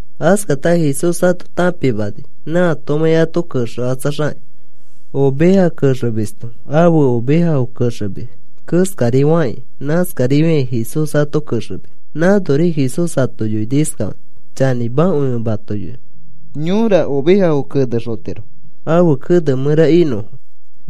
(Askata Jesús ato tãpimani nãatomãi ãto kexekatsaxakĩ. Oveja kexemisto ãfe ovejafo kexemis keskari fakĩ nãskarifiakĩ Jesús ato kexemis.) Nãnori Jesús ato yoini iskafakĩ: “Chanĩmakõi ẽ mato yoinõ. Yõra ovejafo kenexotiro ãfe kene mẽra inõfo,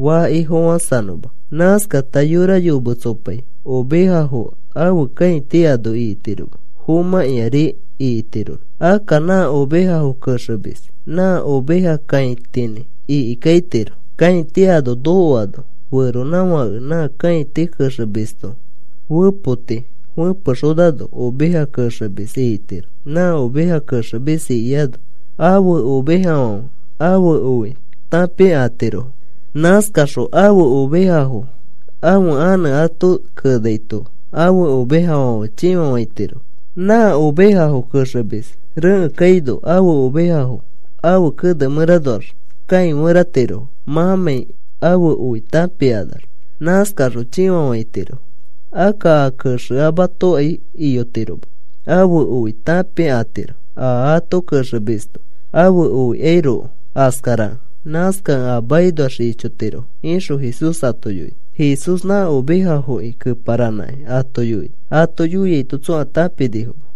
faki fofãsanõma. Nãskata yora yometsopai ovejafo ãfe kãiti ano ikitiroma, fomãkĩari ikitiro. Akka nã ovejafo kexemis nã oveja kãitinĩ ikikaitiro. Kãiti ano nokoano feronãfake nã kãiti kexemisto fepoti fẽpexonano oveja kexemis ikitiro. Nã oveja kexemis ikiano ãfe ovejafãfe ãfe oi tãpikatirofo. Nãskaxõ ãfe ovejafo ãfe anẽ ato kenaito ãfe ovejafãfe chĩfafãitirofo. Nã ovejafo kexemis rekẽ kaino ãfe ovejafo ãfe kene mẽranoax kãiferatirofo. Mãmãi ãfe oi tãpikanax nãskaxõ chĩfafaitirofo. Akka a kexeamatokai iyotiroma, ãfe oi tãpikatiro, a ato kexemisto ãfe oikairoko askarakẽ. Nãskakẽ a makinoax ichotirofo,” ixõ Jesús ato yoini. Jesús nã ovejafoki keparanãkĩ ato yoini. Ato yoiaito tsõa tãpinifoma.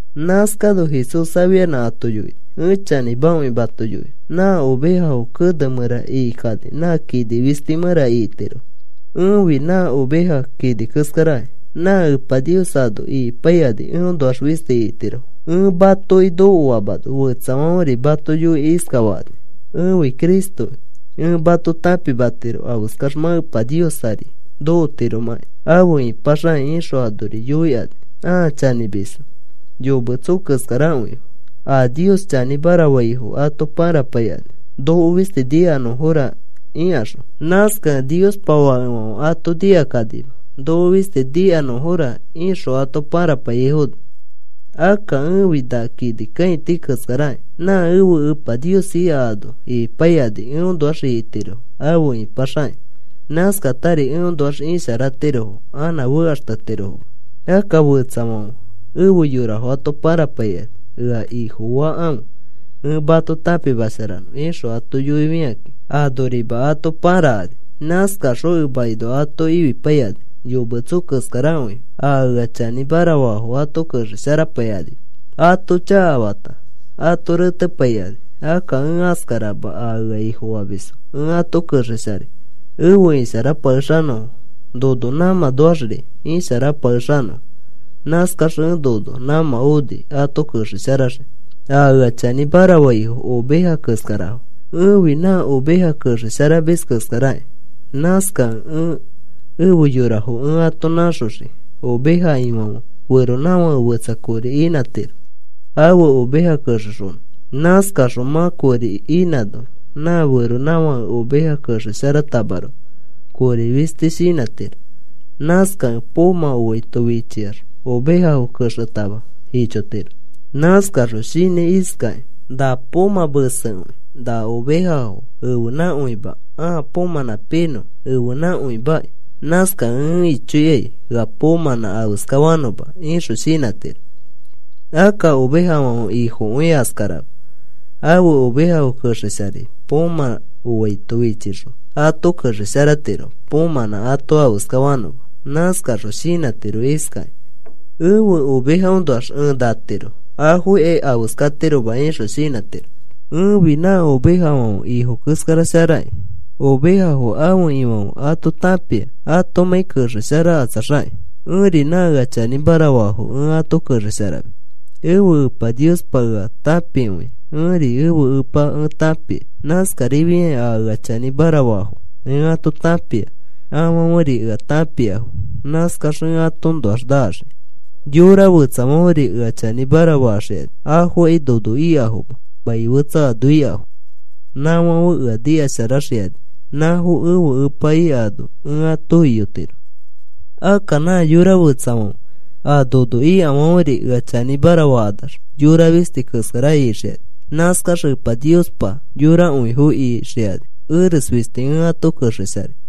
Nãskano Jesús afianã ato yoini: “Ẽ chanĩmakõi mato yoinõ. Nã ovejafo kene mẽra ikikani nã kini fisti mẽra ikitirofo. Ẽfi na oveja kini keskaraki. Nã Epa Nios ano ikipaikani eõnoax fisti ikitirofo. Ẽ matoki nokoamano fetsafãferi mato yoikĩ iskafakani: ‘Ẽfi Cristoki. Ẽ mato tãpimatiro afeskax mã Epa Nios ari nokotiromãki afe ipaxakĩ,’ ixõ anori yoikani ãa chanĩmisfo. Yometso keskarakõifo. A Nios chanĩmara faifo ato pãrapaikani: ‘Noko fisti nikanõfora,’ ikaxõ. Nãskakẽ Niospa fakefãfe ato nikakanima, ‘Noko fisti nikanõfora,’ ixõ ato pãrapaiyaifono. Akka ẽfi na kini kãiti keskaraki. Nã ẽfe Epa Nios ika ano ikipaikani eõnoax ikitirofo afe ipaxakakĩ. Nãskatari eõnoax isharatirofo anã fekaxtetirofoma. Akka fetsafãfe efe yorafo ato pãrapaikani: ‘Ea ifofakãfe. Ẽ mato tãpimasharanõ,’ ixõ ato yoifikakĩ anorima ato pãrakani. Nãskakaxõ emakinoa ato ifipaikani. Yometso keskarakõifo. A ea chanĩmara faafo ato kexesharapaikanima. Ato chakafata ato retepaikani. Akka ẽ askarama. A ea Ifofamisfo ẽ ato kexesharai efe isharapakexanõfo, nono nãmãnoaxri isharapakexanõfo. Nãskax ẽ nono nãmã oni ato kexesharaxikĩ. “A ea chanĩmara faifo ovejafo keskarafo. Ẽfi nã oveja kexesharamis keskaraki. Nãskakẽ ẽ efe yorafo ẽ ato nãxoxii. Oveja ifãfe feronãfake fetsa kori inãtiro ãfe oveja kexexonõ. Nãskaxõ mã kori inãno nã feronãfãke oveja kexesharatamaroko, kori fisti shinãtiro. Nãskakẽ poomã oaito fichiax ovejafo kexetama ichotiro. Nãskaxõ shinãi iskakĩ: ‘Na poomã mesekõi. Na ovejafo ẽfenãkõima, aa poomãnã pinõ ẽfenãkõimakĩ. Nãskakẽ ẽ ichoikai ea poomãnã afeska fanõma,’ ixõ shinãtiro. Akka ovejafãfe ifokõi askarama. Ãfe oveja kexesharai. Poomã oaito fichixõ ato kexesharatiro, poomãnã ato afeska fanõma. Nãskaxõ shinãtiro iskakĩ: ‘Ẽfe ovejafoõnoax ẽ natiro afokai afeskatiroma,’ ixõ shinãtiro. “Ẽfi nã ovejafãfe ifo keskara sharakĩ. Ovejafo ãfe ifãfe ato tãpia atomãi kexesharakatsaxakĩ. Ẽri nã ea chanĩmara faafo ẽ ato kexesharamis. Ẽfe Epa Niospa ea tãpikõia. Ẽri ẽfe Epa ẽ tãpia. Nãskarifiakĩ a ea chanĩmara faafo ẽ ato tãpia. Afãferi ea tãpiafo. Nãskax ẽ atoõnoax naxii. Yora fetsafãferi ea chanĩmara faxikani. Afokai nono ikafoma. Mai fetsa ano ikafo. Nãfãfe ea nikasharaxikani. Nãfo ẽfe Epa ika ano ẽ ato iyotiro. Akka nã yora fetsafãfe a nono ikafãferi ea chanĩmara fakanax yora fisti keskara ixikani. Nãskax Epa Niospa yorakõifo ixikani. Eres fisti ẽ ato kexesharai.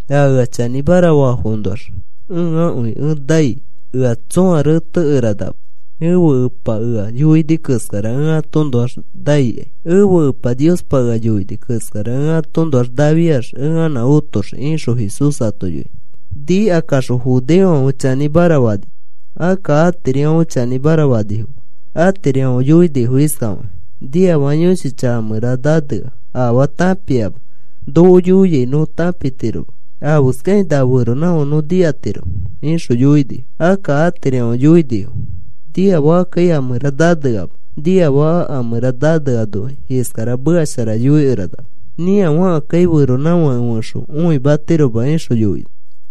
A ea chanĩmara faafoõnoax ẽakõi ẽ nai, ea tsõa retekeranama. Ẽfe Ẽpa ea yoini keskara ẽ atoõnoax naikai. Ẽfe Epa Niospa ea yoini keskara ẽ atoõnoax nafiax ẽ anã otoxii,” ixõ Jesús ato yoini. Nikakaxõ judeofãfe chanĩmara fanifo. Akka atirifãfe chanĩmara fanifoma. Atirifãfe yoini iskafakakĩ: “Nĩafaka yõshi chaka a mẽra nanea. Afaa tãpiama. Noko yoiai nõ tãpitiroma. ¿Afeskakĩ na feronãfake nõ nikatiromẽ?” ixõ yoinifo. Akka atirifãfe yoinifo: “Niafakakai a mẽra naneama. Niafaka a mẽra naneanokai iskara meka shara yoikeranama. Nĩafakakai feronãfake fẽxo õimatiroma,” ixõ yoinifo.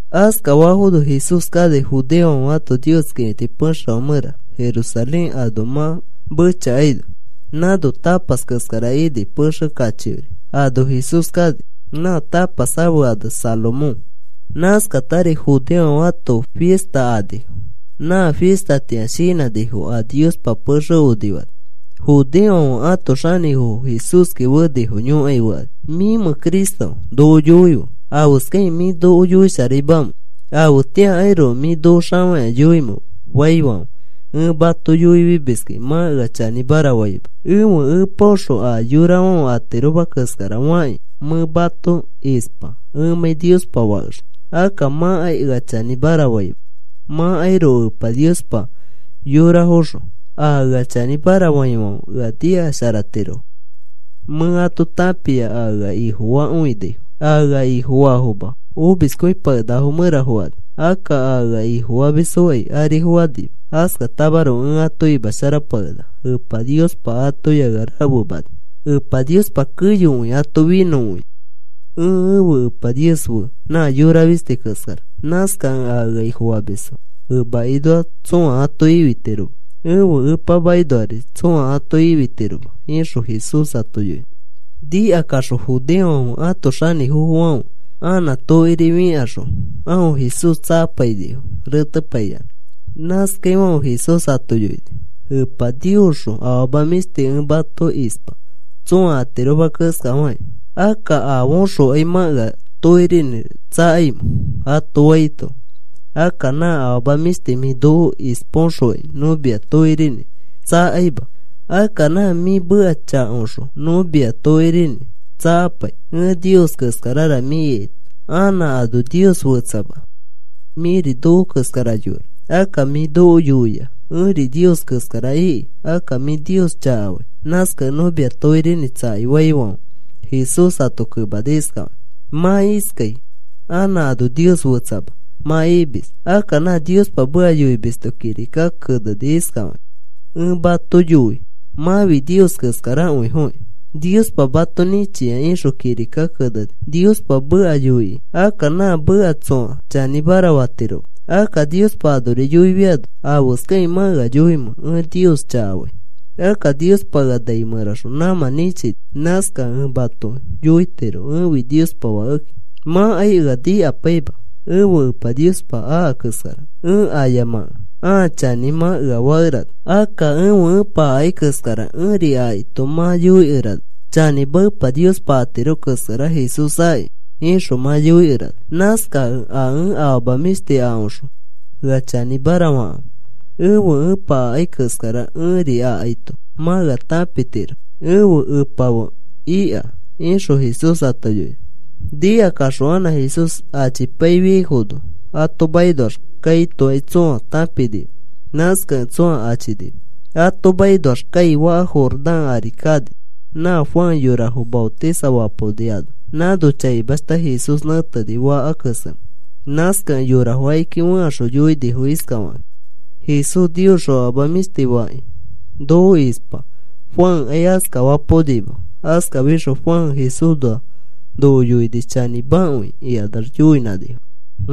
Askafafono Jesús kani judeofãfe ãto Nios kĩfiti pexefã mẽra Jerusalén ano mã mechakaino. Nãno tapas keskara ini pexe kachiori. Ano Jesús kani. Nã tapas ãfe ane Salomón. Nãskatari judeofãfe ãto fista anifo. Nã fistatĩa shinãnifo a Niospa pexe onifani. Judeofãfe ãto xanĩfofo Jesúski fenifo yõkai fekani: “¿Mĩmẽ Cristoki? Noko yoife. ¿Afeskakĩ mĩ noko yoisharaimamẽ? ¿Afetĩakairoko mĩ noko xafakĩa yoimẽ?” faifãfe, “Ẽ mato yoifimiskẽ mã ea chanĩmara faima. Ẽfe Epaõxõ a yorafãfe atiroma keskara fakĩ mẽ mato ispa ẽmãi Niospa Fakexõ. Akka mãkai ea chanĩmara faima mãkairoko Ẽpa Niospa yorafoxõ. A ea chanĩmara faifãfe ea nikasharatirofo. Mẽ ato tãpia a ea Ifofakõinafo. A ea Ifofaafoma omiskõipakenakafo mẽra fokani. Akka a ea Ifofamisfokai ari fokanima. Askatamaroko ẽ ato imasharapakenaka. Epa Niospa atoya ea rafemani. Epa Niospa keyokõi ato finõkõia. Ẽ ẽfe Epa Nios fe nã yora fisti keskara. Nãskakẽ a ea Ifofamisfo emakinoa tsõa ato ifitiroma, ẽfe Epa makinoari tsõa ato ifitiroma,” ixõ Jesús ato yoini. Nikakaxõ judeofãfe ãto xanĩfofofãfe anã tokiri fikaxõ aõ Jesús tsakapainifo retepaiyanã. Nãskafaifãfe Jesús ato yoini: “Epa Niosxõ afama mĩshti ẽ mato ispa tsõa atiroma keskafakĩ. Akka, ¿afaõxokai mã ea tokirinĩ tsakaimẽ?” ato faito, “Akka na afama mĩshti mĩ noko ispaõxokai nõ mia tokirinĩ tsakaima. Akka nã mĩ meka chakaõxõ nõ mia tokirinĩ tsakapai, ẽ Nios keskarara mĩ ikaito. Anã ano Nios fetsama. Mĩri noko keskara yora. Akka mĩ noko yoia: ‘Ẽri Nios keskara,’ iki. Akka mĩ Nios chakafai. Nãskakẽ nõ mia tokirinĩ tsakai,” faifãfe, Jesús ato kemani iskafakĩ: “Mã iskai: ‘Anã ano Nios fetsama,’ mã imis. Akka nã Niospa meka yoimisto kirika keneni iskafakĩ: ‘Ẽ mato yoi mãfi Nios keskarakõifokĩ. Niospa mato nĩchia,’ ixõ kirika keneni, Niospa meka yoikĩ. Akka nã meka tsõa chanĩra fatiroma. Akka Niospa anori yoifiano ¿afeskakĩ mã ea yoimẽ ẽ Nios chakafai? Akka Niospa ea nai mẽraxõ nãmã nĩchini. Nãskakẽ ẽ mato yoitiro ẽfi Niospa Fakeki. Mãkai ea nikapaima. Ẽfe Epa Niospa aka keskara ẽ ayamakẽ, ãa chanĩra mã ea fakerana. Akka ẽfe Epa akai keskara ẽri akaito mã yoikerana: ‘Chanĩma Epa Niospa atiro keskara Jesús aki,’ ixõ mã yoikerana. Nãskakẽ a ẽ afama mĩshti akaõxõ ea chanĩmara fakãfe. Ẽfe Ẽpa akai keskara ẽri akaito mã ea tãpitiro ẽfe Epa fe ika,” ixõ Jesús ato yoini. Nikakaxõ anã Jesús achipaifiaifono, ato makinoax kaitokai tsõa tãpinima. Nãskakẽ tsõa achinima. Ato makinoax kai, faka Jordán ari kani nã Juan yorafo maotisafapaoni ano. Nãno chaimashta Jesús nẽteni faka kesemẽ. Nãskakẽ yorafo akiki fẽkaxõ yoinifo iskafakakĩ: “Jesús Niosxõ afama mĩshti fakĩ noko ispa. Juankai askafapaonima. Askafixõ Juan Jesúsnoa noko yoini chanĩmakõi,” ikanax yoinãnifo.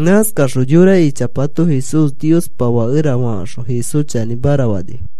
Nãskakaxõ yora ichapato Jesús Niospa fakera fakaxõ Jesús chanĩmara fanifo.